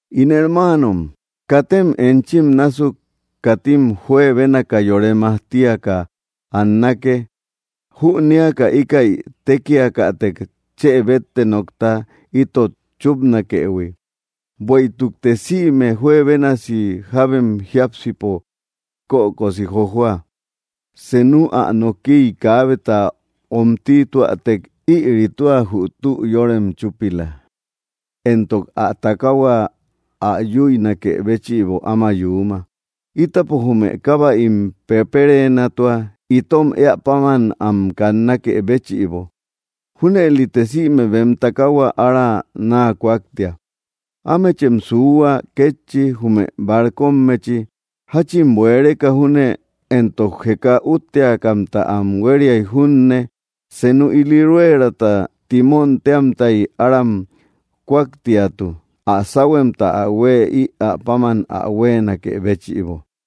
In hermaanom, katem enchim násuk katim juebénaka yore majtia tiaka annake, jünéaka íkäi tékiakätek chë bétte nokta itot chúpnakëhui. Bueïtukte sïme juebénasi jábem jiápsipo kökosi jojua. Senu ä nokiy kaabeta omtituätek, ïri tua jü tü yórem chúpila, éntok ä takaahua ä yüinakë béchïbo áma yuuma. Ítapo jume kábäim pepereenatua itom éä páman am kannakë béchïbo. Júnëlite sïme bem takaahua ára naa kúaktia. Ámechem suuhua kétchi, jume barcommechi: jáchin bueereka júne éntok jeka útteakamta am huériay junne, senu ili rueerata timón téamtay aram kúaktiatu, ä sáhuemta ä huë ïa páman ä huéenakë béchïbo.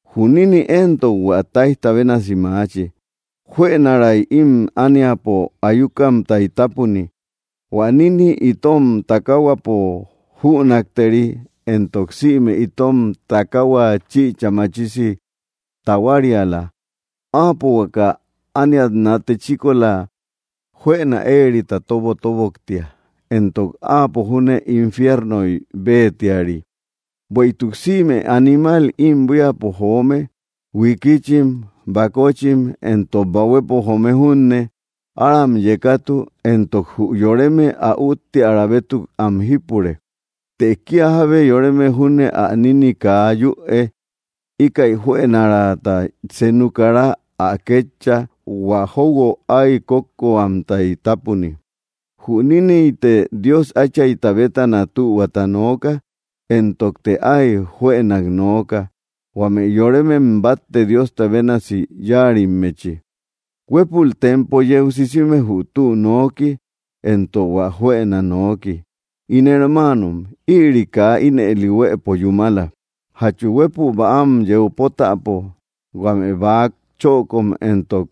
Jü nínni éntok hua táijta bénasi maachi, juënaray ím ániapo ayukamtay tápuni. Huä nínni itom takaahuapo jünakteri, éntok sïme itom takaahua chïcha machisi tahuariala. Áapo huaka ániat nate chíkola juëna éerita tóbotoboktia, éntok áapo júne infiernoy béetiari. Bueïtuk sïme animal ím buíapo joome, huikichim, bakochim, éntok bahuepo joome junne, aram yekatu, éntok jü yoreme ä útteara bétuk am jípure; të kía jábe yoreme junne ä nínni kaa yüe; íkäi juënaraata senu kara ä kétcha; hua jóuguo áy kókókko huamtay tápuni. Jü níniyte Dios Áchayta bétana tühuata nooka, éntokte áy juënak nooka, huame yoremem batte Diosta bénasi yáarimmechi. Huépul tempo yeu sisime jü tü nooki, éntok hua juëna nooki. In hermaanom, ïri kaa ínëli huéepo yúmala. ¿Jachu huépü bäam yeu pótäpo huame bäa chökom éntok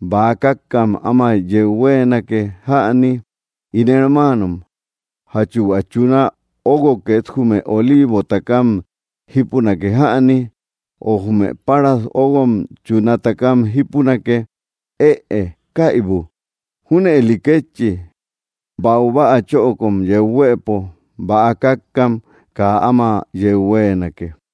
bäa kákkam áma yeu huéenake jäni? In hermaanom, ¿jachu hua chuna óguo két jume oliivo takam jípunake jäni? O, ¿jume páras óguom chuna takam jípunake? ¡Ëe; kaibu! Júnëli kétchi, baubäa chökom yeu huëpo bäa kákkam kaa áma yeu huéenake.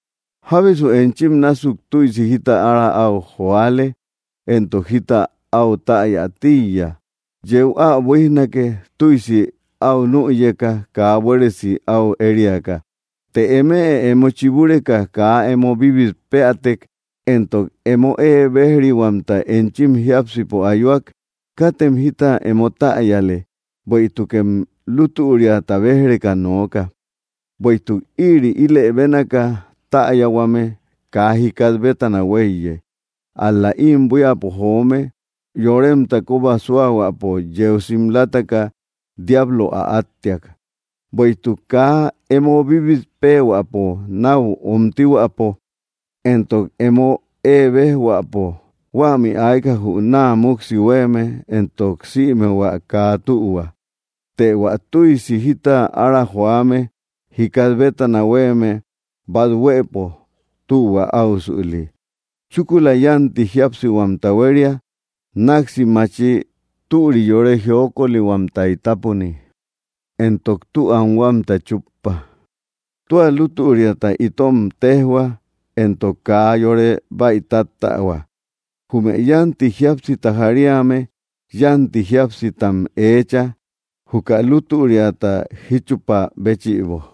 ¿Jábesu enchim násuk tüisi jita ára áu joale, éntok jita áu täya tíiya? Yeu ä buíjnake, tüisi áu nüyeka kaa buéresi áu ériaka. Të eme emo chibureka kaa emo bíbit péätek, éntok emo ée béj‑rihuamta enchim jiápsipo ayuak, katem jita emo täyale, bueïtukem lútüriata béj‑reka nooka. Bueïtuk ïri ílë bénaaka täyahuame kaa jikat bétana huéiye; ál‑la ím buíapo joome; yoremta kóba súahuäpo yeu simlataka, diablo ä áttiak. Bueïtuk kaa emo bíbit péehuäpo náu omtihuäpo, éntok emo ée béj‑huäpo, huämi ayka jü naa múksi huéeme éntok sïme hua kaa tühua. Të hua tüisi jita ára joame jikat bétana huéeme bát huëpo tühua áusüli; chúkula yánti jíapsihuamta huéria; náksi maachi; türi; yore jiokolihuamtay tápuni; éntok tü anhuamta chúppa. Tua lútüriata itom téjhua, éntok kaa yore bäitattähua. Jume yánti jíapsita jariame yánti jíapsitam eecha, juka lútüriata jíchupaa béchïbo.